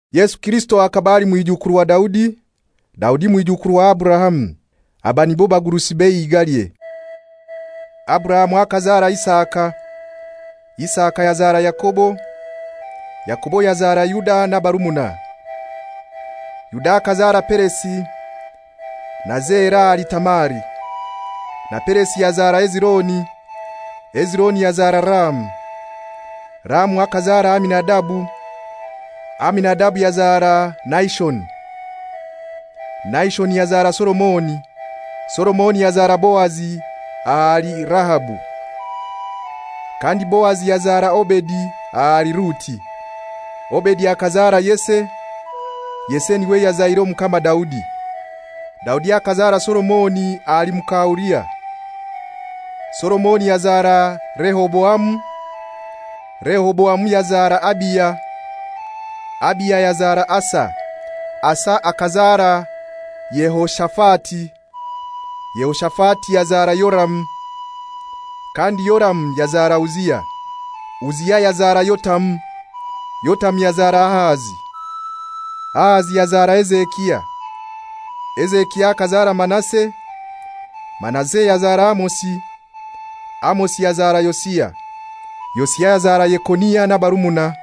Yesu Kirisito akaba ali mwijukuru wa Daudi, Daudi mwijukuru wa Aburahamu. Aba nibo bagurusi b'eihigalye. Aburahamu akazara Isaka, Isaka yazara Yakobo, Yakobo yazara Yuda n'abarumuna. Yuda akazara Peresi na Zera ahali Tamari, na Peresi yazara Hezironi, Hezironi yazara Ramu. Ramu akazara Aminadabu, Aminadabu yazara Nahishoni, Nahishoni yazara Solomoni. Solomoni yazara Boazi ahali Rahabu, kandi Boazi yazara Obedi ahali Ruti. Obedi akazara Yese, Yese niwe yazaire Omukama Daudi. Daudi akazara Solomoni ahali muka Uria, Solomoni yazara Rehoboamu, Rehoboamu yazara Abiya, Abiya yazara Asa. Asa akazara Yehoshafati, Yehoshafati yazara Yoramu, kandi Yoramu yazara Uzia. Uzia yazara Yotamu, Yotamu yazara Ahazi, Ahazi yazara Hezekia. Hezekia akazara Manase, Manase yazara Amosi, Amosi yazara Yosia. Yosia yazara Yekonia n'abarumuna,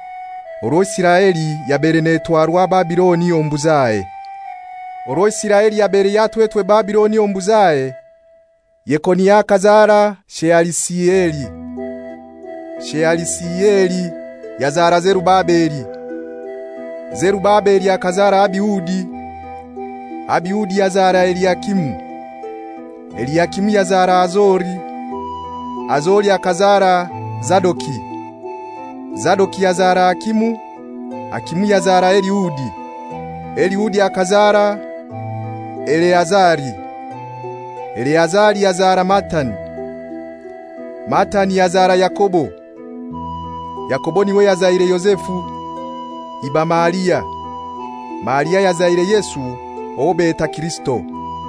orwo Isiraeli yabaire netwarwa Babiloni omu buzahe. Orwo Isiraeli yabaire yatwetwe Babiloni omu buzahe: Yekonia akazara Shealisieli, Shealisieli yazara Zerubabeli. Zerubabeli akazara Abiudi, Abiudi yazara Eliakimu, Eliakimu yazara Azori. Azori akazara Zadoki, Zadoki yazara Akimu, Akimu yazara Eliudi. Eliudi akazara Eleazari, Eleazari yazara Matani, Matani yazara Yakobo. Yakobo niwe yazaire Yozefu iba Maria, Maria ayazaire Yesu owo beta Kirisito.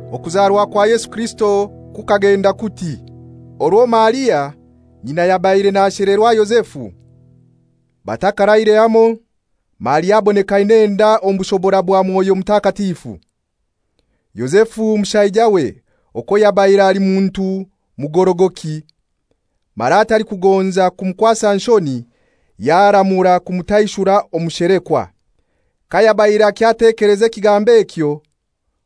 Okuzarwa kwa Yesu Kirisito kukagenda kuti: Orwo Maria, nyina, yabaire nashelerwa Yozefu, batakaraire hamoi, Maria aboneka aina enda omu bushobora bwa Mwoyo Mutakatifu. Yozefu mushaijawe, okwo yabaire ali muntu mugorogoki, mara atalikugonza kumukwasa nshoni, yaramura kumutaishura omu shelekwa. Kayabaire akyatekeleza ekigambo ekyo,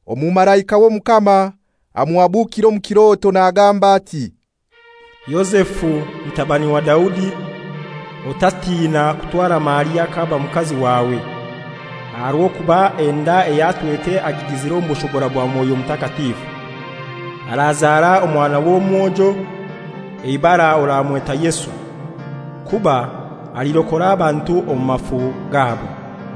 omumalaika w'Omukama amuhabukira omu kiroto, nagamba ati, «Yozefu mutabani wa Daudi, otatina kutwara Maria k'aba mukazi wawe; aha rw'okuba enda ey'atwete agigizire omu bushobora bwa Mwoyo Mutakatifu. Arazara omwana w'omwojo, eibara oramweta Yesu, kuba alirokora abantu omu mafu gabo.»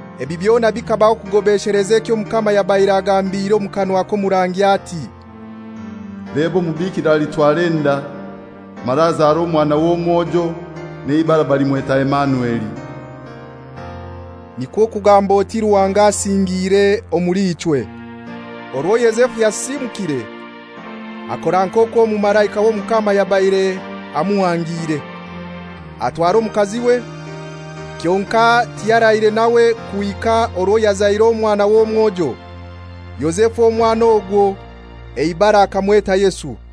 Ebi byona bikabaho kugobesheleza ekyo Omukama yabaire agambire omu kanwa k'omurangi ati, «Leba omubikira alitwara enda, mara azare omwana w'omwojo, n'eibara balimweta Emanueli» (nikwo kugamba oti Ruhanga asingiire omuli ichwe.) Orwo Yozefu yasisimukire, akora nk'okwo omumalaika w'Omukama yabaire amuhangiire. Atwara omukaziwe, Kyonkai tiyaraire nawe kuhika orwo yazaire omwana w'omwojo. Yozefu omwana ogwo eibara akamweta Yesu.